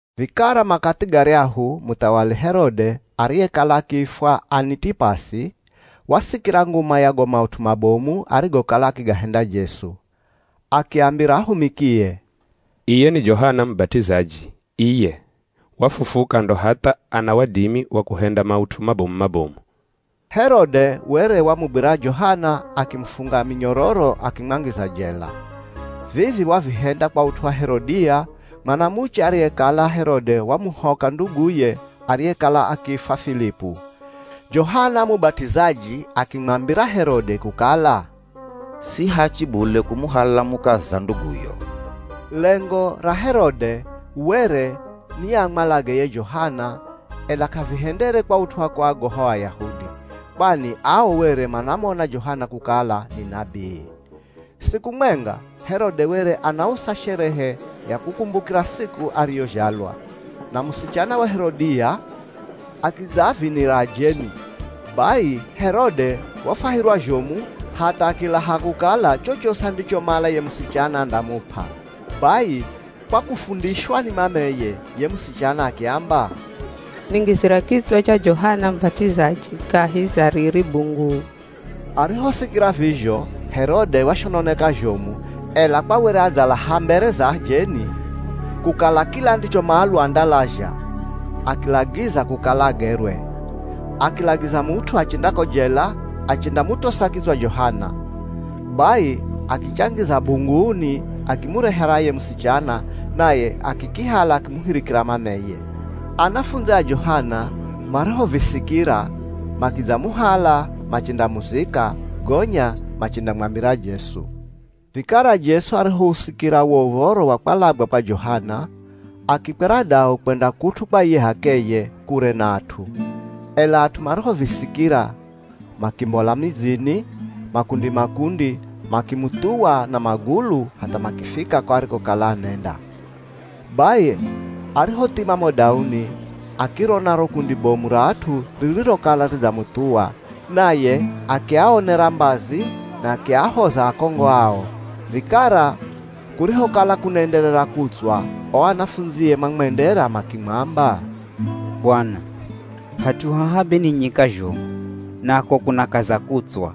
Vikara makathi garyahu muthawali Herode, ariyekala akiifwa Anitipasi wasikira nguma ya go maut'u mabomu arigokala akigahenda Jesu. Akiambira ahumikie, “Iye ni Johana Mubat'izaji iye, wafufuka, ndo hatha ana wadimi wa kuhenda maut'u mabomu-mabomu.” Herode were wamugwira Johana akimufunga minyororo akimwangiza jela. Vivi wavihenda kwa ut'u wa Herodia, mwanamuche ariyekala Herode wamuhoka nduguye ariyekala akiifwa Filipu Johana Mubat'izaji akimwambira Herode kukala, “Si hachi bule kumuhala mukaza nduguyo.” Lengo ra Herode were ni amwalage ye Johana, ela k'avihendere kwa ut'u wa kuagoha o Ayahudi, kwani ao were manamona Johana kukala ni nabii. Siku mwenga, Herode were anausa sherehe ya kukumbukira siku ariyozhalwa, na musichana wa Herodia akidzaavinira ajeni. Bai Herode wafwahirwa zhomu hatha akilaha kukala chochosi andichomala ye musichana andamup'a. Bai kwa kufundishwa ni mameye, ye musichana akiamba, “Ningizira kitswa cha Johana Mubat'izaji kahi za riri bunguu.” Arihosikira vizho, Herode washononeka zhomu, ela kwa were adzalaha mbere za ajeni kukala kila andichomalwa andalazha, akilagiza kukala agerwe. Akilagiza mut'u achenda ko jela, achendamutosa kitswa Johana. Bai akichangiza bunguuni akimurehera ye musichana, naye akikihala akimuhirikira mameye. Anafundzi a Johana marihovisikira, makidzamuhala machendamuzika, gonya machendamwambira Jesu. Vikara Jesu arihousikira wo uv̱oro wa kwalagwa kwa Johana, akikwera dau kwenda kut'u kwa iye h'akeye, kure na at'u. Ela at'u marihovisikira makimbola midzini, makundi-makundi, makimuthuwa na magulu hatha makifika ko arikokala anenda. Bai arihothima mo dauni, akirona ro kundi bomu ra at'u ririrokala ridzamuthuwa, naye akiaonera mbazi na akiahoza akongo ao. Vikara kurihokala kunaenderera kutswa, o anafundzie mamwendera makimwamba, “Bwana, hat'u haha be ni nyika zhomu, nako kunakaza kutswa,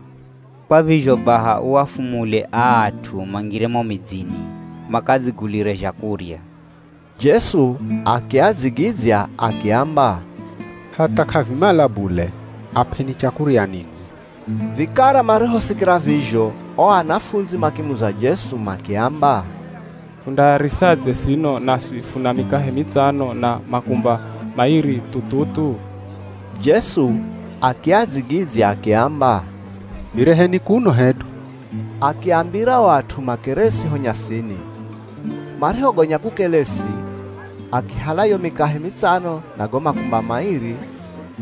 kwa vizho baha uafumule aa at'u mangire mo midzini makadzigulire zhakurya.” Jesu akiadzigidzya akiamba, “Hatha, k'avimala bule, ap'eni chakurya ninwi.” Vikara marihosikira vizho o anafundzi makimuza Jesu makiamba, “Fundaarisadze sino naswi funa mikahe mitsano na makumba mairi thu-thu-thu?” Jesu akiadzigidzya akiamba, “Vireheni kuno hedu.” Akiambira o at'u makeresi ho nyasini. Marihogonya kukelesi, akihala yo mikahe mitsano na go makumba mairi,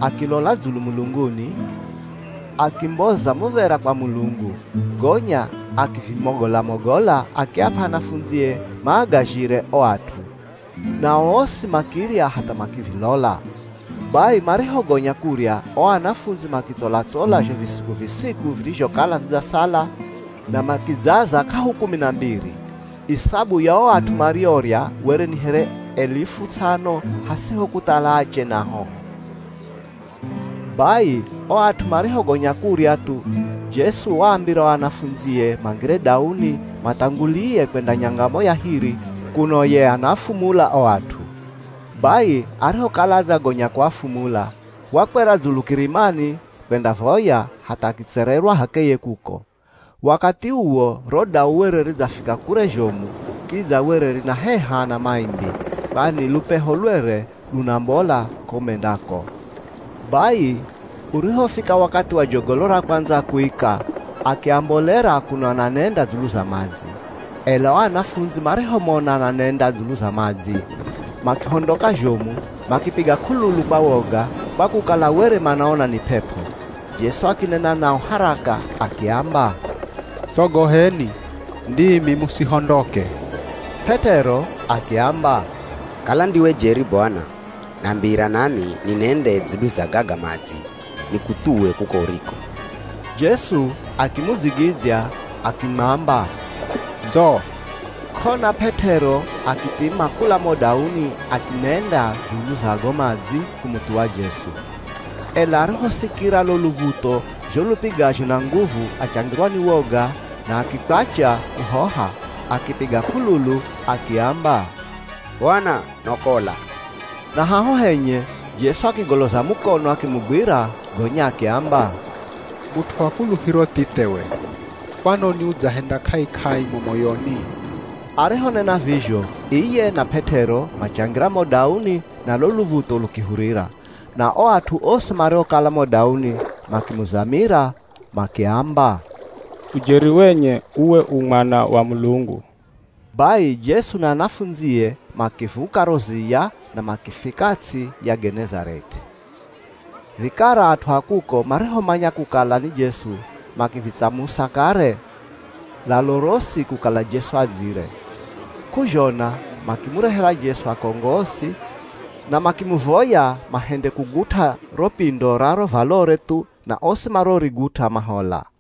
akilola dzulu mulunguni, akimboza muv̱era kwa Mulungu, gonya akivimogola-mogola akiap'a anafundzie maagazhire o at'u. Nao osi makirya hatha makivilola. Bai marihogonya kurya, o anafundzi makitsola-tsola zho visiku-visiku virizhokala vidzasala na makidzaza k'ahu kumi na mbiri. Isabu ya o at'u mariorya were ni here alifu ts'ano, hasiho kuthala ache na ahoho. Bai o at'u marihogonya kurya thu, Jesu waambira o anafundzie mangire dauni mathangulie kwenda nyangamo ya hiri kuno ye anaafumula o at'u. Bai, arihokala adzagonya kuafumula, wakwera dzulu kirimani kwendavoya hatha akitsererwa h'akeye kuko. Wakathi uwo ro dau were ridzafika kure zhomu, kidza were rinaheha na maimbi, kwani lupeho lwere lunambola ko mendako. Bai urihofika wakathi wa jogolo ra kwandza kuika akiambolera kuno ananenda dzulu za madzi. Ela o anafundzi marihomona ananenda dzulu za madzi, makihondoka zhomu, makipiga k'ululu kwa woga, kwa kukala were manaona ni p'ep'o. Jesu akinena nao haraka akiamba, “Sogoheni, ndimi musihondoke.” P'et'ero akiamba, “Kala ndiwe jeri Bwana, nambira nami ninende dzulu za gaga madzi nikuthuwe kuko uriko.” Jesu akimudzigidzya akimwamba, “Ndzo.” K'ona P'et'ero akithima kula mo dauni akinenda dzulu za go madzi kumuthuwa Jesu. Ela arihosikira lo luv̱utho zho lupigazho na nguvu achangirwa ni woga na akikwacha kuhoha. Akipiga k'ululu akiamba, “Bwana, nokola!” Na haho henye Jesu akigoloza mukono akimugwira gonya akiamba, “Mut'u wa kuluhiro thithe we, kwanoni udzahenda k'ai-k'ai mo moyoni?” Arihonena vizho, iye na P'et'ero machangira mo dauni na lo luv̱utho lukihurira. Na o at'u osi mariokala mo dauni makimuzamira makiamba, “Ujeri wenye uwe u Mwana wa Mulungu.” Bai Jesu na anafundzie makivuka ro ziya na makifika ts'i ya Genezarethi. Vikara at'u a kuko marihomanya kukala ni Jesu, makivitsamusa kare lalo rosi kukala Jesu adzire. K'uzhona makimurehera Jesu akongo osi, na makimuvoya mahende kugut'a ro pindo ra ro valore thu, na osi mariorigut'a mahola.